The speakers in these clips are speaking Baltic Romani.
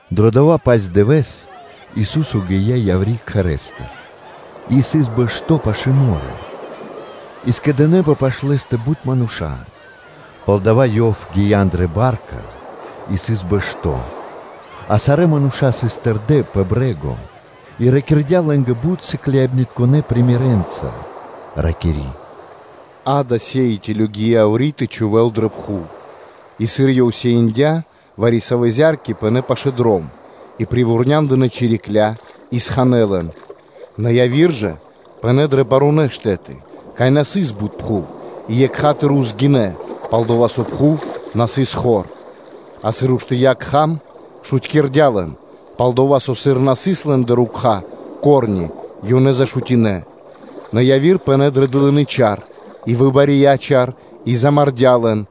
Дро дова́-паць дывэ́с Ису́со гия́ яври́ кхэрэ́стыр и сыс бэшто́ пашы́л мо́рё (дэрья́в). И скэдынэ́пэ пашы́л Лэ́стэ бут мануша́, палдава́ ёв гия́ андрэ́ ба́рка и сыс бэшто́, а сарэ́ мануша́ сыс тэрдэ́ пэ брэ́го. И ракирдя́ лэ́нгэ бут сыкляибнытконэ примерэнца, ракири́: “Акэ, сеиныбнаскиро гия́ яври́ тэ чхувэ́л зя́рка дрэ пхув: и, сыр ёв сеиндя, вари-савэ́ зя́рки пынэ́ пашы́л дром, и привурняндынэ чирикля́ и сханэ лэн; нэ яви́р ж пынэ́ пэ барунэ́ штэ́ты, кай на сыс бут пхув, и екха́тыр (сра́зу) гинэ́ упрэ́, пал-дова́ со пхув на сыс хор, а сыр уштыя́ кхам, шутькирдя лэн; пал-дова́ со, сыр на сыс лэ́ндэ ко́рни (рукха́), ёнэ зашутинэ; нэ яви́р пынэ́ дрэ хру́сты сувьенца, и выбария чар и замардя́ лэн;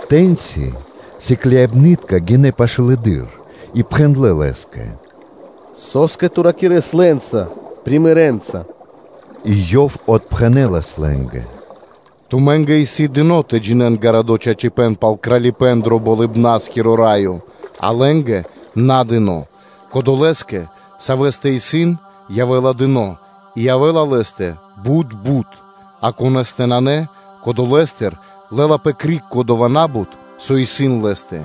Тэ́ньци сыкляибны́тка гинэ́ пашылэды́р и пхэндлэ́ Лэ́скэ: “Со́скэ Ту ракирэ́са лэ́нца примеренца (сыкаибнэнца)?” И Ёв отпхэнэ́лас лэ́нгэ: “Тумэ́нгэ исын дыно́ тэ джинэ́н гарадо́ чачипэ́н пал Кралипэ́н дро Болыбна́скиро Раё, а лэ́нгэ на дыно́; кодолэ́скэ, савэ́стэ исын, явэ́ла дыно́ и явэ́ла лэ́стэ бут бут, а конэ́стэ нанэ, кодолэстыр лэ́лапэ криг кодова́ на́бут, со исын лэ́стэ.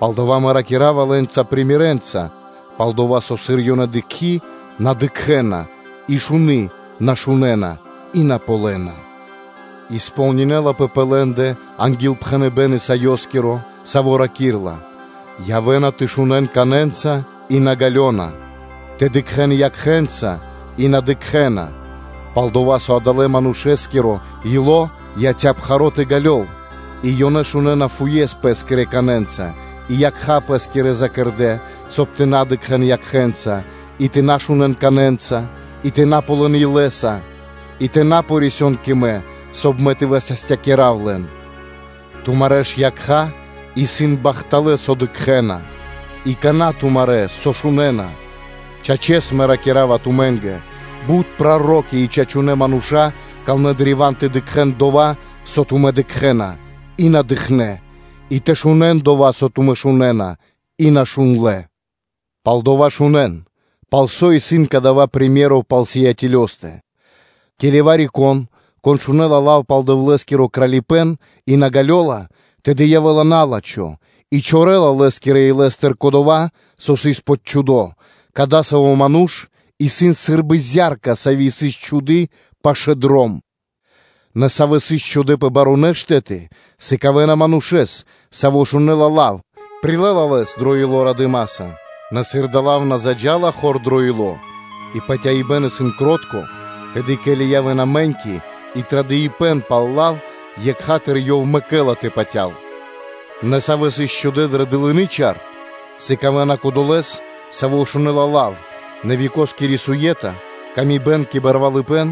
Палдава́ Мэ ракира́ва лэ́нца примерэнца (сыкаибэ́н), пал-дова́ со, сыр ёнэ дыкхи́, на дыкхэ́на, и шуны, на шунэ́на, и на ґалёна; и сполнинэлапэ пэ лэ́ндэ ангилпхэныбэ́н Исаёскиро, саво́ ракирэ́ла: ‘Явэ́на тэ шунэ́н канэнца, и на ґалёна; тэ дыкхэ́н якхэ́нца, и на дыкхэ́на; пал-дова́ со адалэ́ манушэ́нгиро ило́ кашталыя, и ёнэ шунэ́на фуес пэ́скирэ канэнца и якха́ пэ́скирэ закэрдэ, соб (кай) тэ на дыкхэ́н якхэ́нца, и тэ на шунэ́н канэнца, и тэ на ґалён илэ́са, и тэ на рисён кэ Мэ, соб (кай) Мэ тэ высастякирав лэн.’ Тумарэ́ ж якха́ исын бахталэ́, со дыкхэ́на, и кана́ тумарэ́, со шунэ́на, Чачэс, Мэ ракира́ва тумэ́нгэ: бут проро́ки и чачунэ́ мануша́ камлэ́ древа́н тэ дыкхэ́н дова́, со тумэ́ дыкхэ́на, и на дыкхнэ́, и тэ шунэ́н дова́, со тумэ́ шунэ́на, и на шундлэ́. Палдава́ шунэ́н, пал со исын кадава́ сыкаибэ́н (приме́ро) пал сеиныбнаскирэстэ. Ке́ли вари-кон, кон шунэ́ла лав пал Дэвлэ́скиро Кралипэ́н, и на ґалёла, тэды явэ́ла на́лачхо и чорэла лэ́скирэ илэ́стыр кодова́, со сыс почхудо: кадасаво́ ману́ш исын сы́рбы зя́рка, сави́ сыс чхуды́ пашы́л дром. Нэ савэ́ сыс чхудэ́ пэ барунэ́ штэ́ты, сыкавэ́на манушэ́с, саво́ шунэ́ла лав, прилэ́ла лэс екха́тыр (сра́зу) дро ило́ радыма́са; нэ сыр дава́ лав на заджа́ла хор дро ило́ и патяибэ́н исын кротко, тэды, ке́ли явэ́на мэ́ньки и традыпэн пал лав, екха́тыр ёв мэкэ́ла тэ патял. Нэ савэ́ сыс чхудэ́ дрэ дылыны чар, сыкавэ́на кодолэ́с, саво́ шунэ́ла лав, нэ векоскири суе́та, тырдыпэ́н кэ барвалыпэ́н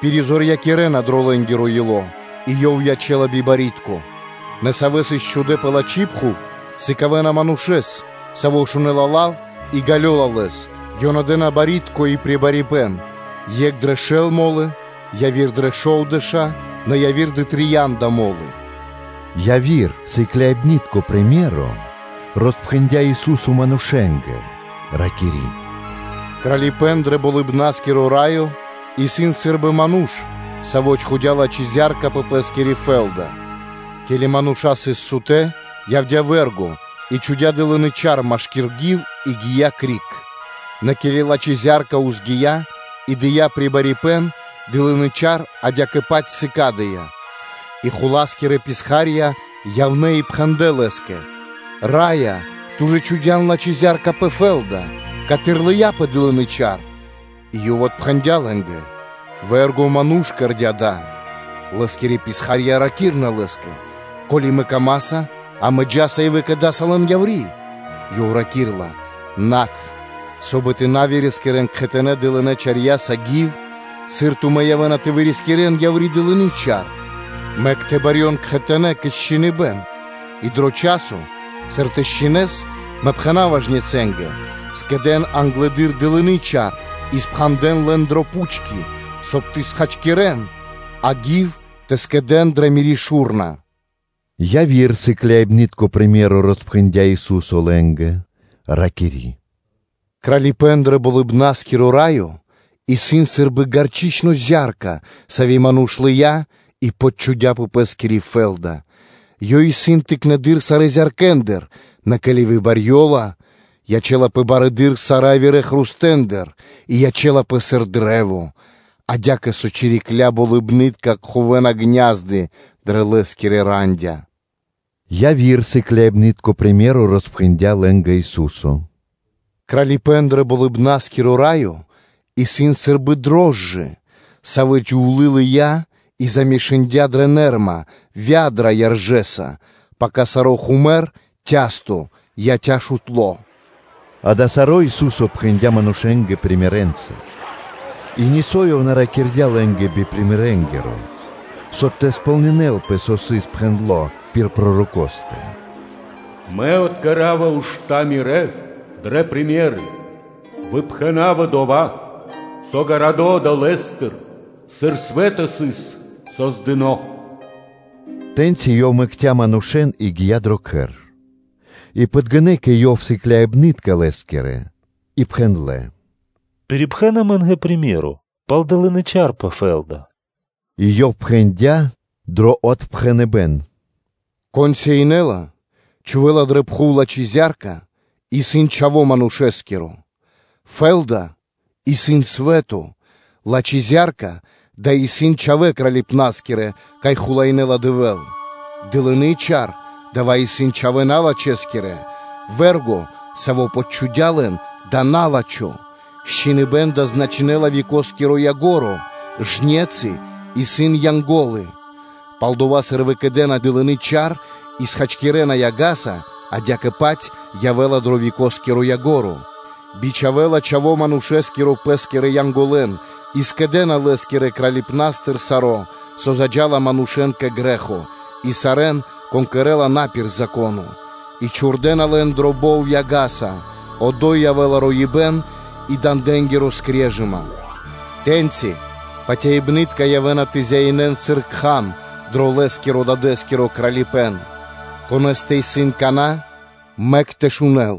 пиризорьякирэна дро лэ́нгиро ило́, и ёв ячэ́ла би барьякирдэскиро. Нэ савэ́ сыс чхудэ́ пэ лачхи́ пхув, сыкавэ́на манушэ́с, саво́ шунэ́ла лав и ґалёла лэс, ёнэ дэ́на барьякирдэскиро (плодоскиро) и прибарипэн екх дрэ шэл мо́лы, яви́р дрэ шовдэша́, нэ яви́р дрэ трия́нда мо́лы.” Яви́р сыкляибны́тко сыкаибэ́н роспхэндя́ Ису́со манушэ́нгэ, ракири́: “Кралипэ́н дро Болыбна́скиро Раё исын сы́рбы ману́ш, саво́ чхудя́ лачхи́ зя́рка пэ пэ́скири фэ́лда. Ке́ли мануша́ сыс сутэ́, явдя́ вэ́рго и чхудя́ дылыны чар машки́р гив и гия́ криг. Нэ ке́ли лачхи́ зя́рка ўзгия и дыя́ прибарипэн, дылыны чар адя́кэ-паць сыкадыя́. И хула́скирэ писха́рья явнэ́ и пхэндлэ́ лэ́скэ: ‘Раё, ту ж чхудя́н лачхи́ зя́рка пэ фэ́лда? Каты́р лыяпэ дылыны чар?’ И ёв отпхэндя́ лэ́нгэ: ‘Вэ́рго ману́ш кэрдя́ дава́.’ Лэ́скирэ писха́рья ракирна лэ́скэ: ‘Ко́ли камэ́са, амэ джа́са и выкэдаса лэн яври́.’ Ёв раки́рла: ‘Над, соб (кай) тэ на вырискирэн кхэтанэ́ дылынэ́ чарьяса гив, сыр тумэ́ явэ́на тэ вырискирэн яври́ дылыны чар. Мэк тэ барьён кхэтанэ́ кэ счхиныбэн; и дро часо, сыр тэ счхинэн, мэ пхэна́ва жнецэнгэ: ‘Скэдэ́н англэды́р дылыны чар и пхандэн лэн дрэ пучки, соб (кай) тэ хачкирэ́н; а гив тэ скэдэ́н дрэ Мири́ шу́рна.’” Яви́р сыкляибны́тко сыкаибэ́н роспхэндя́ Ису́со лэ́нгэ, ракири́: “Кралипэ́н дро Болыбна́скиро Раё исын сы́рбы гарчычно зя́рка, сави́ ману́ш лыя́ и почхудя пэ пэ́скири фэ́лда, ёй исын тыкнэды́р сарэ́ зяркэндыр, нэ ке́ли выбарьёла, ячэ́лапэ барэды́р сарэ́ явирэ хрустэндыр и ячэ́лапэ сыр кашт, адя́кэ со чирикля́ болыбны́тка кхувэна гня́зды (ку́фы) дрэ лэ́скирэ рандя́.” Яви́р сыкляибны́тко приме́ро роспхэндя́ лэ́нгэ Ису́со: “Кралипэ́н дро Болыбна́скиро Раё исын сы́рбы дрожджы (рожчына), савэ́ джувлы́ лыя́ и замешындя дрэ вядра (нэмра) яржэса, пака саро́ хумэр (цясто) яця́ шутло.” Акэ, саро́ Ису́со пхэндя́ манушэ́нгэ примерэнца (сыкаибнэнца); и нисо́ Ёв на ракирдя́ лэ́нгэ би примерэнгиро, соб (кай) тэ сполнинэ́лпэ, со сыс пхэндло́ пир пророкостэ: “Мэ откэрава ушта́ Мирэ́ дрэ примеры (сыкаибэна); выпхэнава дова́, со гарадо́ одолэ́стыр, сыр свэ́то сыс создыно́.” Тэ́ньци Ёв мэкця́ манушэ́н и гия́ дро кхэр. И подгинэ́ кэ Ёв сыкляибны́тка Лэ́скирэ и пхэндлэ́: “Пирипхэн амэ́нгэ приме́ро (сыкаибэ́н) пал дылыны чар пэ фэ́лда.” И Ёв пхэндя́ дро отпхэныбэ́н: “Кон сеинэла (чхувэ́ла) дрэ пхув лачхи́ зя́рка исын Чхаво́ Манушэ́скиро; фэ́лда исын свэ́то; лачхи́ зя́рка-дава́ исын чхавэ́ Кралипнаскирэ, кай хулаинэла Дэвэ́л; дылыны чар-дава́ исын чхавэ́ налачхэскирэ, вэ́рго, саво́ почхудя лэн-дава́ исын на́лачхо, счхиныбэн-дава́ значынэ́ла векоскиро ко́нцо (яго́ро), жнецы исын Янго́лы. Палдава́, сыр выкэдэна дылынэ́ чарья́ и схачкирэна яга́са, адя́кэ-паць явэ́ла дро векоскиро ко́нцо (яго́ро): бичхавэ́ла Чхаво́ Манушэ́скиро Пэ́скирэ Янголэн, и скэдэ́на Лэ́скирэ Кралипнастыр саро́, со злыджала манушэ́н кэ грэ́хо, и сарэ́н, кон кэрэ́ла на пир Зако́но; и чхурдэна лэн дро бов яга́са; одо́й явэ́ла роибэ́н и дандэнгири скрежыма. Тэ́ньци патяибнытка явэ́на тэ зяинэн сыр кхам дро лэ́скирэ Дадэ́скиро Кралипэ́н. Конэ́стэ исын кана́, мэк тэ шунэ́л.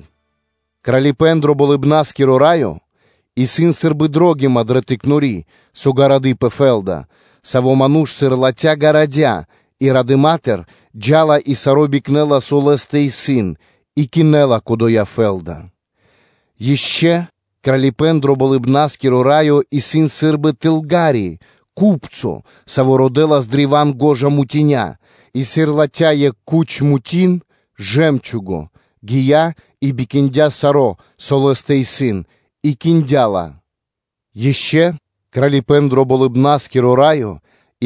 Кралипэ́н дро Болыбна́скиро Раё исын сы́рбы дро́гима дро кучипэ́н, со исын гарады пэ фэ́лда, саво́ ману́ш, сыр латхя́, гарадя, и радыма́тыр джа́ла и саро́ бикнэла, со лэ́стэ исын, и кинэла кодоя фэ́лда. Ишчо Кралипэ́н дро Болыбна́скиро Раё исын сы́рбы ку́пцо (тылга́ри), саво́ родэлас древа́н гожа мутиня; и сыр латхя́ екх куч мутин (жэмчуго), гия́ и бикиндя саро́, со лэ́стэ исын и киндя ла. Ишчо Кралипэ́н дро Болыбна́скиро Раё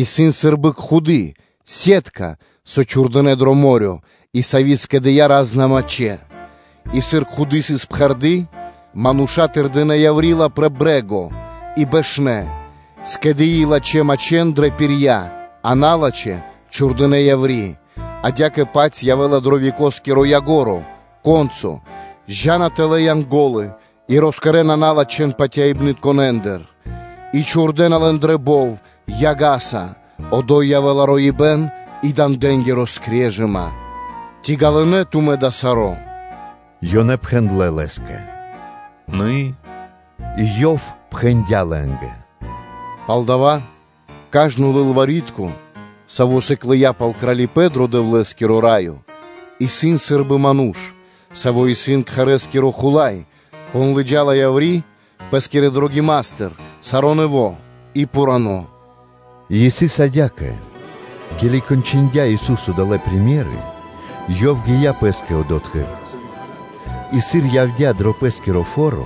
исын сы́рбы бари кхуды́ (сетка), со чхурдынэ́ дро мо́рё (дэрья́в) и сави́ скэдыя́ ра́зна мачхэ́, и сыр кхуды́ сыс пхэрды́, мануша́ тырдынэ яври́ ла пэ брэ́го и бэшнэ́, скэдыи лачхэ́ мачхэ́ дрэ пирья, а налачхэ́ чхурдынэ́ яври́. Адя́кэ-паць явэ́ла дро векоскиро ко́нцо (яго́ро): джа́на тэлэ́ Янго́лы и роскэдэна налачхэн патяибнытконэндыр, и чхурдэна лэн дро бов яга́са; одо́й явэ́ла роибэ́н и дандэнгири скрежыма.” “Ци ґалынэ́ тумэ́ дава́ саро́?” Ёнэ пхэндлэ́ Лэ́скэ: “Адя́кэ, Раё.” и Ёв пхэндя́ лэ́нгэ: “Палдава́ кажно лылвари́тко (кни́жнико), саво́ сыклыя пал Кралипэ́н дро Дэвлэ́скиро Раё, исын сы́рбы ману́ш, саво́ исын кхэрэ́скиро хула́й, кон лыджа́ла яври́ пэ́скирэ кучипнаскирэ пиралятыр саро́ нэво́ и пхурано́.” И исын адя́кэ: ке́ли кончындя Ису́со далэ́ примеры (сыкаибэна), Ёв гия́ пэ́скэ одотхы́р. И сыр Ёв явдя́ дро Пэ́скиро фо́ро,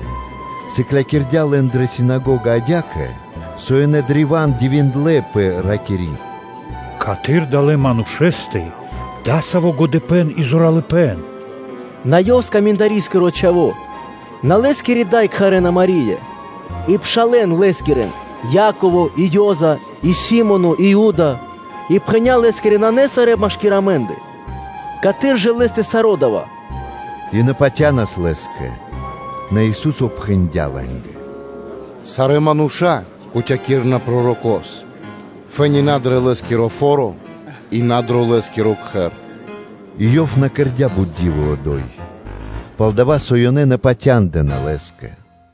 сыклякирдя́ лэн дрэ синагога адя́кэ, со ёнэ древа́н дивиндлэ́пэ, ракири́: “Каты́р адалэ́ манушэ́стэ исын дасаво годыпэ́н и зоралыпэ́н? На Ёв исын скаминдарискиро Чхаво́? На Лэ́скирэ Да кхарэ́на Мари́я, и пшалэ́н Лэскирэн Яково и Ёза и Си́моно и Юда? и пхэня́ Лэ́скирэ нанэ сарэ́ машки́р амэ́ндэ? Каты́р жа Лэ́стэ саро́ дава́?” И на патянас Лэ́скэ. Нэ Ису́со пхэндя́ лэ́нгэ: “Сарэ́ мануша́ кутякирэна пророко́с, фэ́ни на дро Лэ́скиро фо́ро и на дро лэ́скиро кхэр” И Ёв на кэрдя́ бут ди́вы одо́й, пал-дова́ со ёнэ на патяндынэ́ Лэ́скэ.